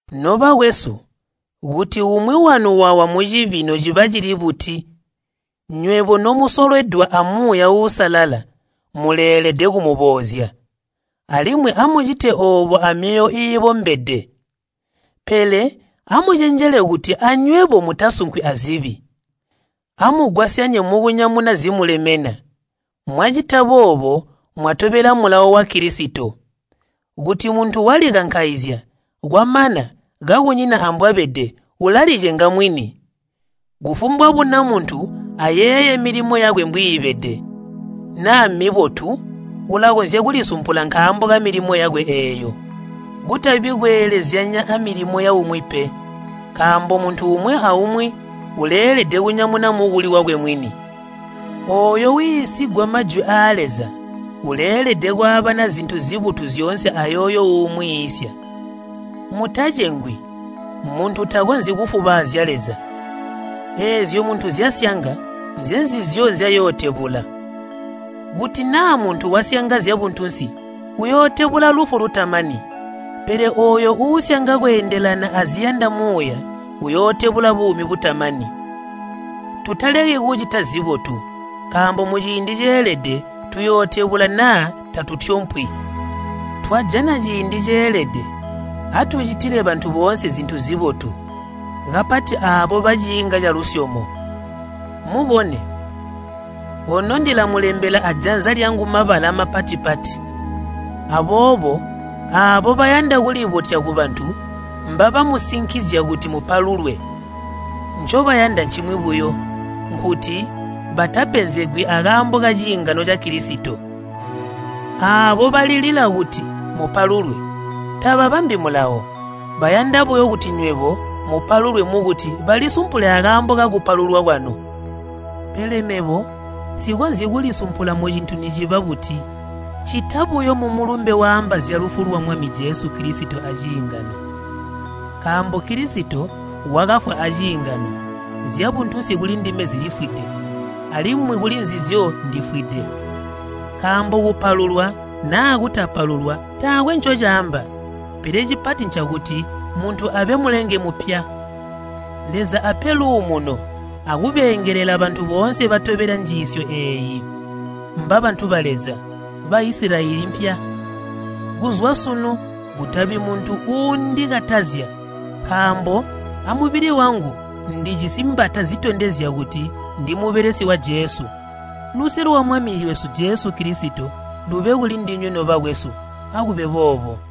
Nobakwesu, kuti umwi wanu wawa mucibi nociba cili buti, nywebo nomusolwedwa a Muuya Uusalala muleelede kumuboozya, alimwi amucite oobo amyoyo iibombede. Pele amucenjele kuti anywebo mutasunkwi azibi. Amugwasyanye mukunyamuna zimulemena. Mwacita boobo, mwatobela mulawo wa Kilisito. Kuti muntu walikankaizya, kwamana kakunyina ambwabede, ulalicenga mwini. Kufumbwa buna muntu ayeeye milimo yakwe mbwiibede. Naa mmibotu, ulakonzya kulisumpula nkaambo kamilimo yakwe eeyo, kutabi kweelezyanya amilimo yaumwi pe. Nkaambo muntu umwi aumwi uleelede kunyamuna mukuli wakwe mwini. Ooyo wiisigwa Majwi aa Leza uleelede kwaabana zintu zibotu zyoonse ayooyo uumwiisya. Mutacengwi, muntu takonzyi kufubaazya Leza. Eezyo muntu nzyasyanga nzenzizyo nzyayootebula. Kuti naa muntu wasyanga zyabuntunsi uyootebula lufu lutamani, pele ooyo uusyanga kweendelana aziyanda Muuya uyootebula buumi butamani. Tutaleki kucita zibotu, nkaambo muciindi ceelede tuyootebula naa tatutyompwi. Twajana ciindi ceelede atucitile bantu boonse zintu zibotu, kapati aabo baciinga calusyomo. Mubone, ono ndilamulembela ajanza lyangu mabala mapati-pati. Aboobo aabo bayanda kulibotya kubantu mbabamusinikizya kuti mupalulwe. Ncobayanda ncimwi buyo, nkuti batapenzegwi akaambo kaciingano ca Kilisito. Aabo balilila kuti mupalulwe, tababambi Mulawo. Bayanda buyo kuti nywebo mupalulwe mukuti balisumpule akaambo kakupalulwa kwanu. Pele mebo nsikonzyi kulisumpula mucintu niciba buti, ccita buyo mumulumbe waamba zyalufu lwa Mwami Jesu Kilisito aciingano. Nkaambo Kilisito wakafwa aciingano, zyabuntunsi kulindime zilifwide, alimwi kulinzizyo ndifwide. Nkaambo kupalulwa naa kutapalulwa taakwe ncocaamba, pele cipati ncakuti muntu abe mulenge mupya. Leza ape luumuno akubeengelela bantu boonse batobela njiisyo eeyi, mbabantu ba Leza, Baisilayeli mpya. Kuzwa sunu kutabi muntu uundikatazya, nkaambo amubili wangu ndijisi mbata zitondezya kuti ndi mubelesi wa Jesu. Luse lwa Mwami wesu Jesu Kilisito lube kulindinywe nobakwesu. Akube boobo.